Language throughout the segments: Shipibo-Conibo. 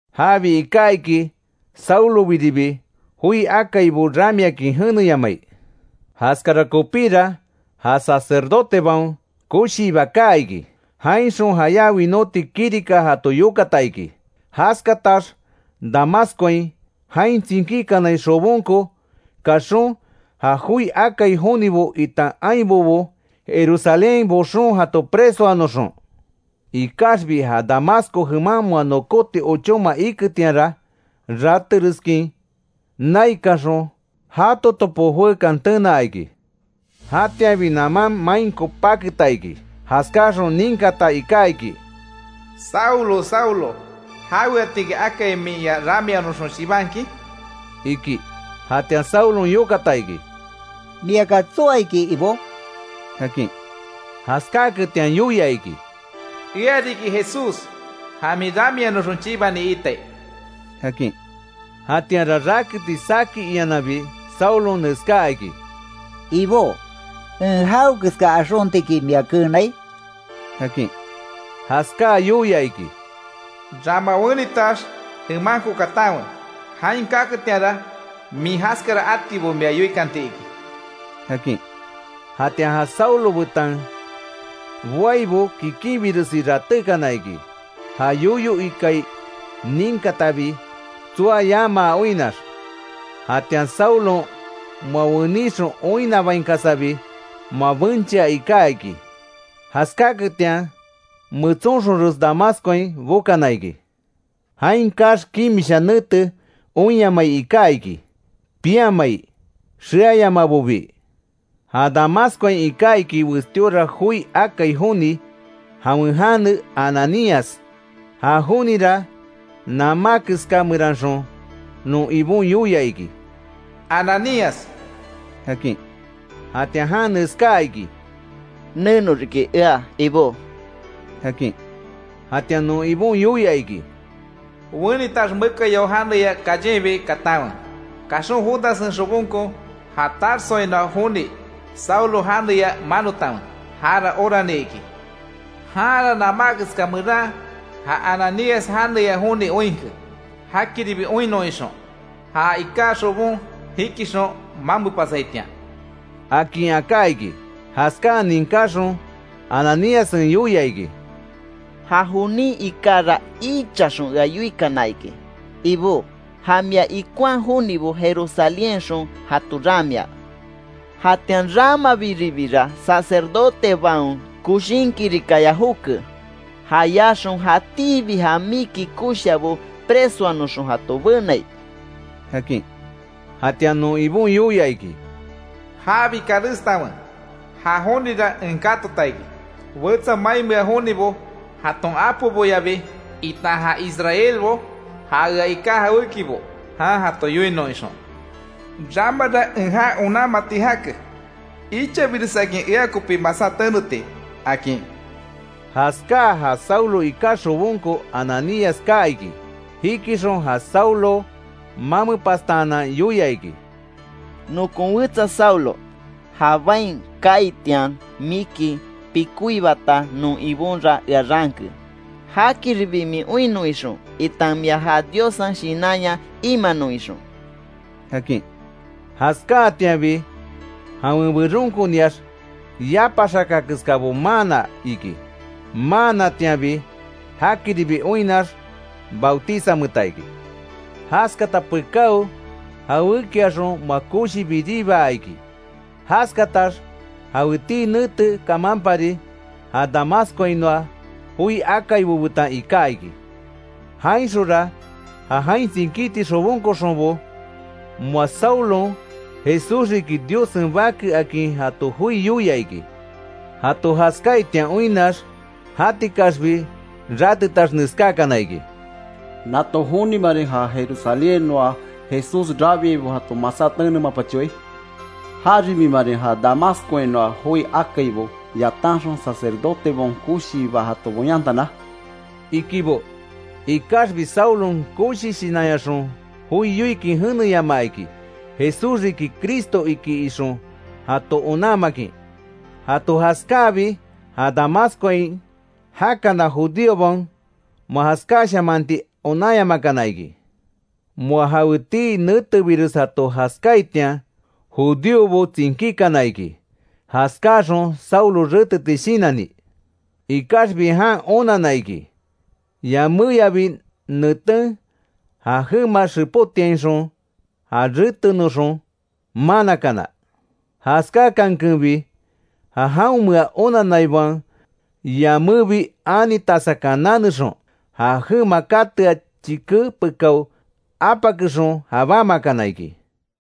Jabi iká iki Saulobiribi joi akaibo ramiakin jeneyamai. Jaskara kopíra, ja sacerdotebaon koshiiba kaa iki. Jainxon jayá winóti kirika jato yokata iki. Jaskatax Damascoain jain tsinkíkanai xobonko kaxon, ja joi akai jonibo itan ainbobo, Jerusalénhain boxon jato presoanoxon. Ikaxbi ja Damasco jeman moa nokóti ochóma iketianra, ratereskin naikanxon jato topo joekan tenaa iki. Jatianbi naman mainko paketa iki, jaskáxon ninkata iká iki: “Saulo, Saulo ¿Jaweatiki akai min ea ramianoxon chibankin?” iki. Jatian Saulon yokata iki: “¿Miaki tsoa iki, Ibó?” akin. Jaskáaketian yoia iki: “Ea riki Jesús ja min ramianoxon chibani iitai”, akin. [Jatianra raketi saki iananbi Saulon neskaa iki: —Ibó ¿En jawekeska axontiki mia keenai?] —akin. Jaskáa yoia iki: “Rama wenitax jemanko katanwe, jain kaketianra, min jaskara atibo mia yoikanti iki”, akin. Jatian ja Saulo betan boaibo kikinbiresi ratékana iki, ja yoyo ikai ninkatabi tsoa yamaa oinnax. Jatian Saulon, moa wenixon oinnabainkasabi moa benchea iká iki. Jaskáketian metsonxonres Damascoain bokana iki. Jain kaax kimisha nete oinyamai iká iki, piamai, xeayamabobii. Ja Damascoain iká iki, westíora joi akai joni, jawen jane Ananías. Ja jonira namá keska meranxon non Ibon yoia iki: “¡Ananías!” akin. Jatian jan neskaa iki: “Neno riki ea, Ibó”, akin. Jatian non Ibon yoia iki: “Wenitax, mekayao janeya callenbi katanwe. Kaxon Judassen xobonko ja Tarsoainoa joni Saulo janeya manotanwe. Jara orani iki. Janra namá keska meran ja Ananías janeya joni oinke; jakiribi oinnon ixon ja iká xobon jikixon mamepasaitian”, akin aká iki. Jaskáa ninkáxon Ananíassen yoia iki: “Ja jonin ikára ichaxon ea yoikana iki, Ibó; ja mia ikonhaa jonibo Jerusalénhainxon jato ramia. Jatian ramabiribira, sacerdotebaon coshin kirikaya joke; jayaxon jatíbi ja miki koshiabo presoanoxon jato benai”, akin. Jatian non Ibon yoia iki: “Jabi karestanwe, ja jonira en katota iki, wetsa mainmea jonibo jaton apoboyabi, itan ja Israelbo, ja ea iká jawékibo jan jato yoinon ixon. Ramara en já onanmati jake, ichabiresakin ea kopí masá teneti”, akin. Jaskáa ja Saulo iká xobonko Ananías kaa iki. Jikixon ja Saulo mamepastaanan yoia iki: —Nokon wetsa Saulo, ja bain kaaitian miki pikoibata non Ibonra ea raanke, jakiribi min oinnon ixon itan mia ja Diossen Shinanya imanon ixon —akin. Jaskáatianbi, jawen beronkoniax yapa xaka keskábo maana iki. Maanatianbi jakiribi oinnax, bautizameeta iki. Jaskata pekáo, jawékiaxon moa koshi biribaa iki. Jaskatax jawetii nete kamanpari, ja Damascoainoa joi akaibo betan iká iki. Jainxonra, ja jain tsinkíti xobonkoxonbo, moa Saulon, Jesús riki Diossen Bake akin jato joi yoia iki. Jato jaskáaitian oinnax, jatikaxbi ratetax neskákana iki: —¿Nato jonimarin ja Jerusalénhainoa Jesús rabiaibo jato masá tenemapachoai? ¿Jaribimarin ja Damascoainoa joi akaibo yatanxon, sacerdotebaon koshiiba jato boyantana? —ikibo. Ikaxbi Saulon koshi shinanyaxon joi yoikin jeneyamaa iki Jesús riki Cristo iki ixon jato onanmakin. Jato jaskáabi, ja Damascoain jakana judíobaon moa jaskashamaanti onanyamakana iki. Moa jawetii netebires jato jaskáaitian, judíobo tsinkíkana iki, jaskáaxon Saulo reteti shinanni. Ikaxbi jan onanna iki, yaméyabi neten ja jema xepotiainxon já retenoxon manakana. Jaskákankenbi, ja jaonmea onanaibaon yamébi ani tasakan nanexon, ja jema katea chike pekao apakexon jabámakana iki.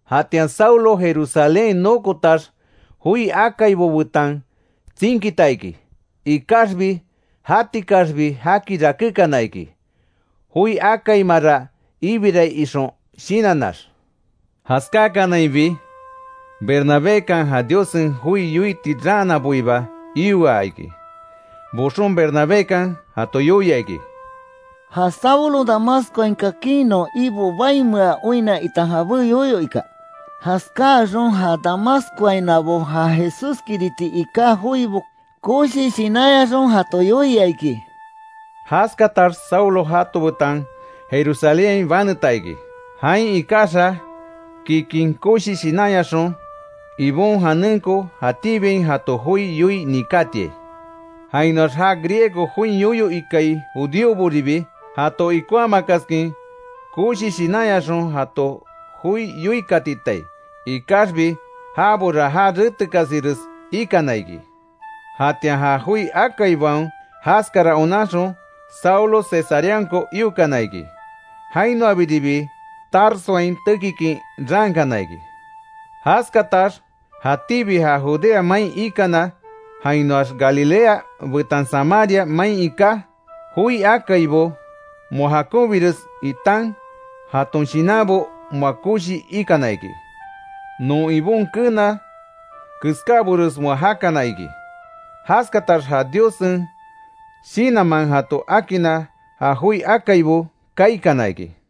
Jatian Saulo Jerusalénhain nokotax, joi akaibo betan tsinkita iki. Ikaxbi jatikaxbi jaki rakékana iki, joi akaimara ibirai ixon shinannax. Jaskákanainbi, Bernabékan ja Diossen joi yoiti raanaboiba ioa iki, boxon Bernabékan jato yoia iki: Ja Saulon Damascoain kakin non Ibo baimea oinna itan jabé yoyo ika. Jaskáaxon ja Damascoainoabo ja Jesúskiriti iká joibo koshi shinanyaxon jato yoia iki. Jaskatax Saulo jato betan Jerusalénhain baneta iki, jain ikaxa kikin koshi shinanyaxon, Ibon janenko jatíbiain jato joi yoii nikátiai. Jainoax ja griego join yoyo ikai judíoboribi, jato ikonhamakaskin koshi shinanyaxon jato joi yoikatitai, ikaxbi jabora já retekasires ikana iki. Jatian ja joi akaibaon jaskara onanxon, Saulo Cesareanko iokana iki. Jainoabiribi Tarsoain tekikin raankana iki. Jaskatax jatíbi ja Judea main ikana, jainoax Galilea betan Samaria main iká joi akaibo, moa jakonbires itan jaton shinanbo moa koshi ikana iki. Non Ibon keena keskábores moa jakana iki. Jaskatax ja Diossen Shinanman jato akinna ja joi akaibo kaikana iki.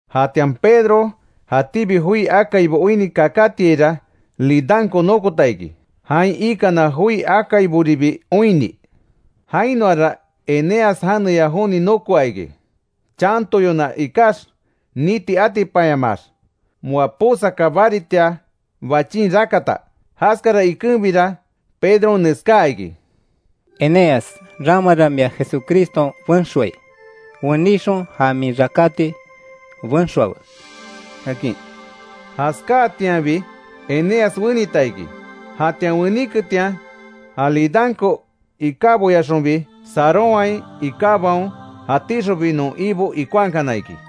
Jatian Pedro jatíbi joi akaibo oinni kakátiaira, Lidanko nokota iki, jain ikana joi akaiboribi oinni. Jainoara Eneas janeya joni nokoa iki, chantoyona ikax niti atipanyamaax, moa posaka baritia bachin rakata. Jaskara ikenbira, Pedron neskaa iki: —Eneas ramara mia Jesucriston benxoai, wenixon ja min rakáti benxoawe —akin. Jaskáatianbi Eneas wenita iki. Jatian weniketian, ja Lidanko ikáboyaxonbi, Sarónhain ikábaon jatíxonbi non Ibo ikonhakana iki.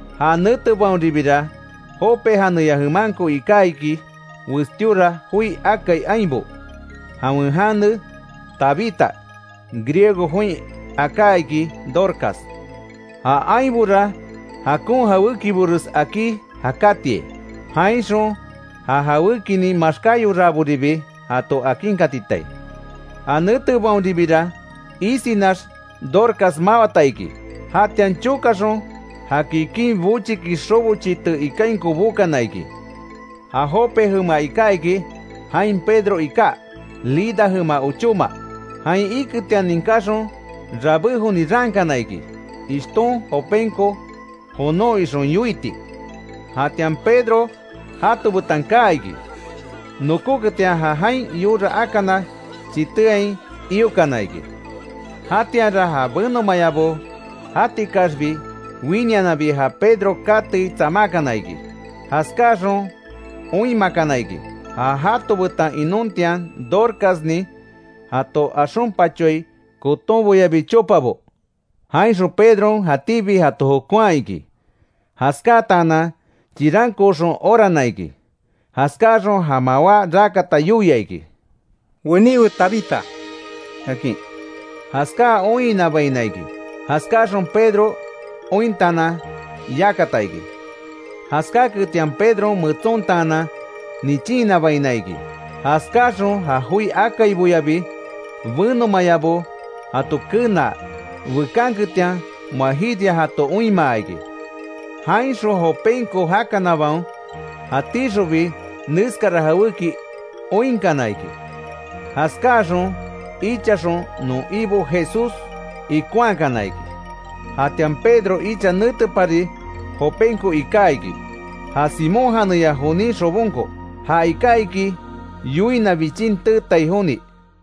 Ja netebaonribira, Jope janeya jemanko iká iki westíora joi akai ainbo, jawen jane Tabita, Griego join aká iki Dorcas. Ja ainbora jakon jawékibores akí jakátiai, jainxon ja jawékinin maxkáyoraaboribi jato akinkatitai. Ja netebaonribira isinax, Dorcas mawata iki. Jatian chokaxon ja kikin bochiki xobo chité ikainko bokana iki. Ja Jope jema iká iki, jain Pedro iká Lida jema ochóma; jain iketian ninkáxon rabé joni raankana iki, ishton Jopenko jonon ixon yoiti. Jatian Pedro jato betan kaa iki, nokóketian ja jain yora akana chiteain iokana iki. Jatianra ja benomaayabo jatikaxbi, winiananbi ja Pedro katei tsamákana iki, jaskáaxon oinmakana iki, ja jato betan inontian Dorcasnin jato axonpachoai kotonboyabi chopabo. Jainxon Pedron jatíbi jato jokonhaa iki. Jaskáatanan chirankooxon orana iki. Jaskáaxon ja mawá rakata yoia iki: —¡Weníwe Tabita! —akin. Jaskáa oinhinabaina iki, jaskáaxon Pedro ointaanan yakata iki. Jaskáketian Pedron metsontaanan nichinhinabaina iki, jaskáaxon ja joi akaiboyabi, benomayabo jato kenaa bekanketian moa jiria jato oinmaa iki. Jainxon Jopenko jakanabaon jatíxonbi neskara jawéki oinkana iki; jaskáaxon ichaxon non Ibo Jesús ikonhakana iki. Jatian Pedro icha netepari Jopenko iká iki, ja Simón janeya jonin xobonko; ja iká iki yoina bichin teetai joni.